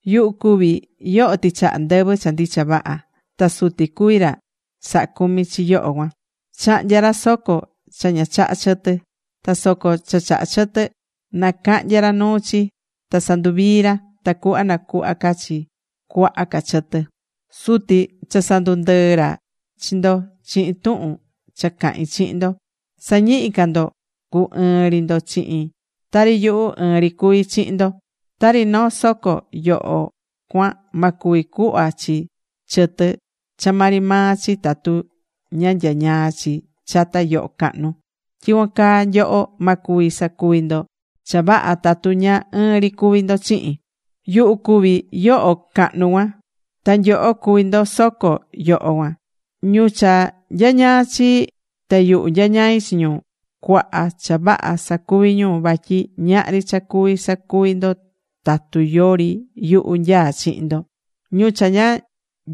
’Yuhu cuví yoho tɨchaha ndɨvɨ cha ndicha vaha. Ta Suti cuví ra sahá cumi chi yoho cuan. Chahnyá ra soco cha ña chahá chɨtɨ. Ta soco cha chahá chɨtɨ nacahnyá ra nuu chi, ta sanduvií ra, tacuhva nacuhva ca chi cuaha ca chɨtɨ. Suti cha sandundɨɨ̱ ra chi ndo chihin tuhun cha cahín chihin ndo. Sa̱ñihi ca ndo cu ɨɨn ri ndo chihin, tari yuhu ɨɨn ri cuví chihin ndo. Tari noo soco yoho cuan ma cuvi cuhva chi chɨtɨ cha maa ri maa chi tatu ña nyañaá chi chata yoho cahnu, tyicuan caa nyoho, ma cuvi sacuvi ndo cha vaha tatu ña ɨɨn ri cuvi ndo chihin. ’Yuhu cuví yoho cahnu cuan. Ta nyoho cuví ndo soco yoho cuan. Ñu cha nyañaá chii, ta yuhu nyañaí chi ñu, cuaha cha vaha sacuví ñu, vatyi ñahri cha cuví sacuvi ndo tatu yori yuhu nyaá chihin ndo. Ñu cha ña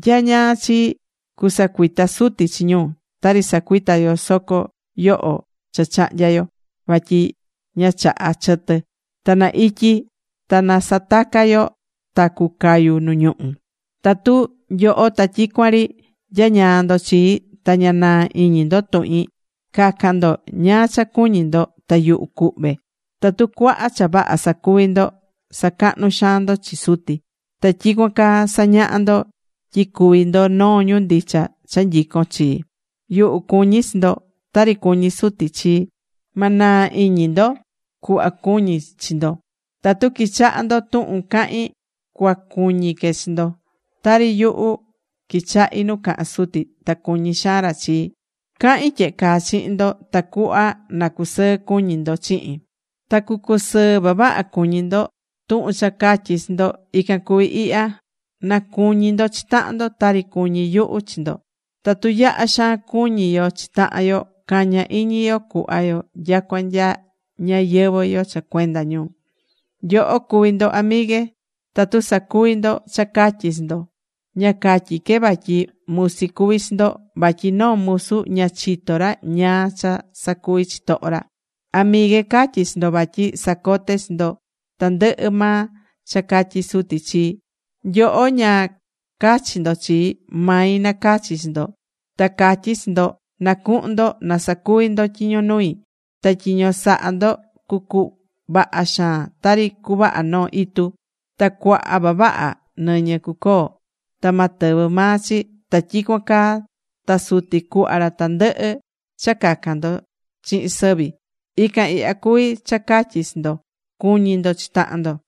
nyañaa chii, cusacuita Suti chi ñu, tari sacuitá yo soco yoho cha chahnya̱ yo vatyi ña chahá chɨtɨ. Ta na ityi ta nasataca yo, ta cucayu nu ñuhu. ’Tatu nyoho ta tyicuan ri nyañaa ndo chii, ta ña naa iñi ndo tuhin, ca̱can ndo ñáá cha cuñí ndo, ta yuhu cuhve. Tatu cuaha cha vaha sacuví ndo, sacahnú xaan ndo chi Suti. Ta tyicuan caa sañahá ndo tyi cuví ndo noo ñu ndicha cha nyicón chii. Yuhu cuñí chi ndo, tari cuñí Suti chii. Ma naa iñi ndo cuhva cuñí chi ndo. Tatu quichahá ndo tuhun cahín, cuacuñi que chi ndo. Tari yuhu quichahí nu cahán Suti, ta cuñí xaan ra chii. ’Cahín tyehe caa chihin ndo tacuhva na cusɨɨ cuñí ndo chihin. Ta cucusɨɨ vavaha cuñi ndo. Tuhun cha catyí chi ndo, ican cuví ihya: na cuñi ndo chi tahan ndo, tari cuñí yuhu chi ndo. Tatu yaha xaan cuñí yo chi tahan yo, caña iñi yo cuhva yo nyacua nya ñayɨvɨ̱ yo cha cuenda ñu. Nyoho cuví ndo amigue, tatu sacuví ndo cha catyí chi ndo. Ña catyí que vatyi musi cuví chi ndo, vatyi noo musu ña chitó ra ñáá cha sacuví chitoho ra. Amigue, catyí chi ndo vatyi sacote̱ chi ndo tandɨhɨ maa cha catyi̱ Suti chii. Nyoho ña cachi̱ ndo chii. Mai nacachi̱ chi ndo. Ta catyi̱ chi ndo na cuhun ndo ta sa̱cuvi ndo tyiño nui. Ta tyiño sahá ndo cucuvaha xaan tari cuvaha noo itu. Ta cuaha vavaha nɨñɨ cucoo, ta ma tɨvɨ maa chi. Ta tyicuan caa ta Suti cuhva ra tandɨhɨ cha cacan ndo chihin sɨvi. Ican ihya cuví cha catyí chi ndo: Cu̱ñi ndo chi tahan ndo.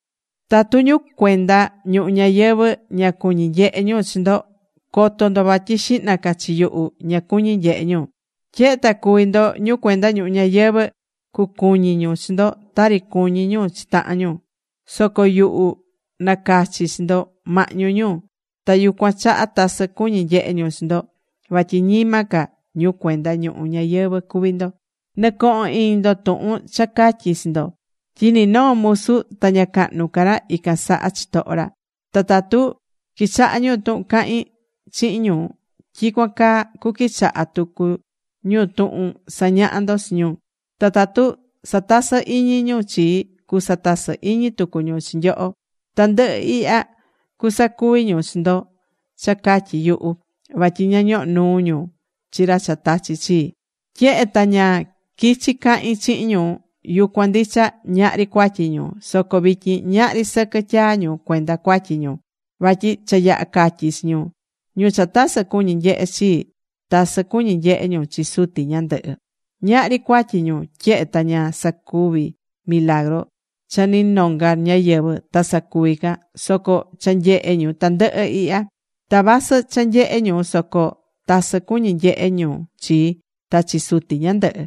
’Tatu ñu cuenda ñuhu ñayɨvɨ̱ ña cuñí nyehe ñu chi ndo, co̱to ndo vatyi xihna ca chi yuhu ña cuñi̱ nyehe ñu. Tyehe ta cuví ndo ñu cuenda ñuhu ñayɨvɨ̱, cucuñi ñu chi ndo tari cuñí ñu chi tahan ñu. Soco yuhu nacachi̱ chi ndo mahñu ñu. Ta yucuan chaha tasɨ cuñí nyehe ñu chi ndo, vatyi ñima ca ñu cuenda ñuhu ñayɨvɨ̱ cuví ndo. Nɨ̱cohon iñi ndo tuhun cha catyi̱ chi ndo, tyi ni noo musu ta ña cahnu ca ra ican saha chitoho ra. Ta tatu quichahá ñu tuhun cahín chihin ñu, tyicuan caa cuquichaha tucu ñu tuhun sañaha ndo chi ñu. Ta tatu satasɨ́ iñi ñu chii, cusatasɨ iñi tucu ñu chi nyoho. Tandɨhɨ ihya cusacuvi ñu chi ndo cha catyi yuhu, vatyi ña ñohó nuu ñu chi ra cha tachi̱ chii. ’Tyehe ta ña quichi̱ cahin chihin ñu, yucuan ndicha ñahri cuatyi ñu. Soco vityin ñahri sɨquɨ tyaa ñu cuenda cuatyi ñu, vatyi cha yaha̱ catyi chi ñu. Ñu cha tasɨ cuñí nyehé chii, tasɨ cuñí nyehé ñu chi Suti ñandɨhɨ. Ñahri cuatyi ñu, tyehe ta ña sacuví milagru cha ni nonga ñáyɨvɨ ta sacuvi ca. Soco cha nyehé ñu tandɨhɨ ihya. Ta vasɨ cha nyehé ñu soco tasɨ cuñí nyehé ñu chii, ta chi Suti ñandɨhɨ.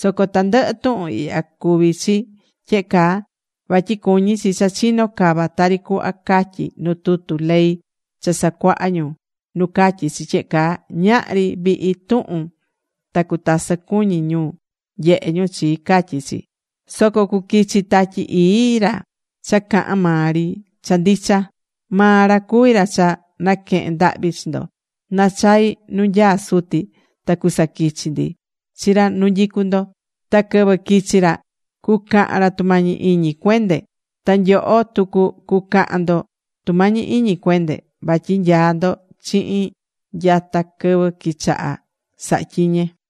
Soco tandɨhɨ tuhun ihya cuví chi tyehe caa, vatyi cuñí chi cha chino cava tari cuhva catyí nu tutu ley cha sacuaha ñu nu catyí chi tyehe caa: “Ñahri vihi tuhun, ta cutasɨ cuñi̱ ñu nyehe ñu chii”, catyí chi. ’Soco cuquichi Tatyi Ii, ra cha cahán maa ri cha ndicha. Maa ra cuví ra cha naquehen ndahvi chi ndo. Nachai nu nyaá Suti ta cusaquichi ndi chi ra nu nyicú ndo. Ta quɨvɨ quichi ra, cucahan ra tumañi iñi cuende. Ta nyoho tucu cucahan ndo tumañi iñi cuende, vatyi nyaá ndo chihin nyata quɨvɨ quichaha̱ sahatyiñe.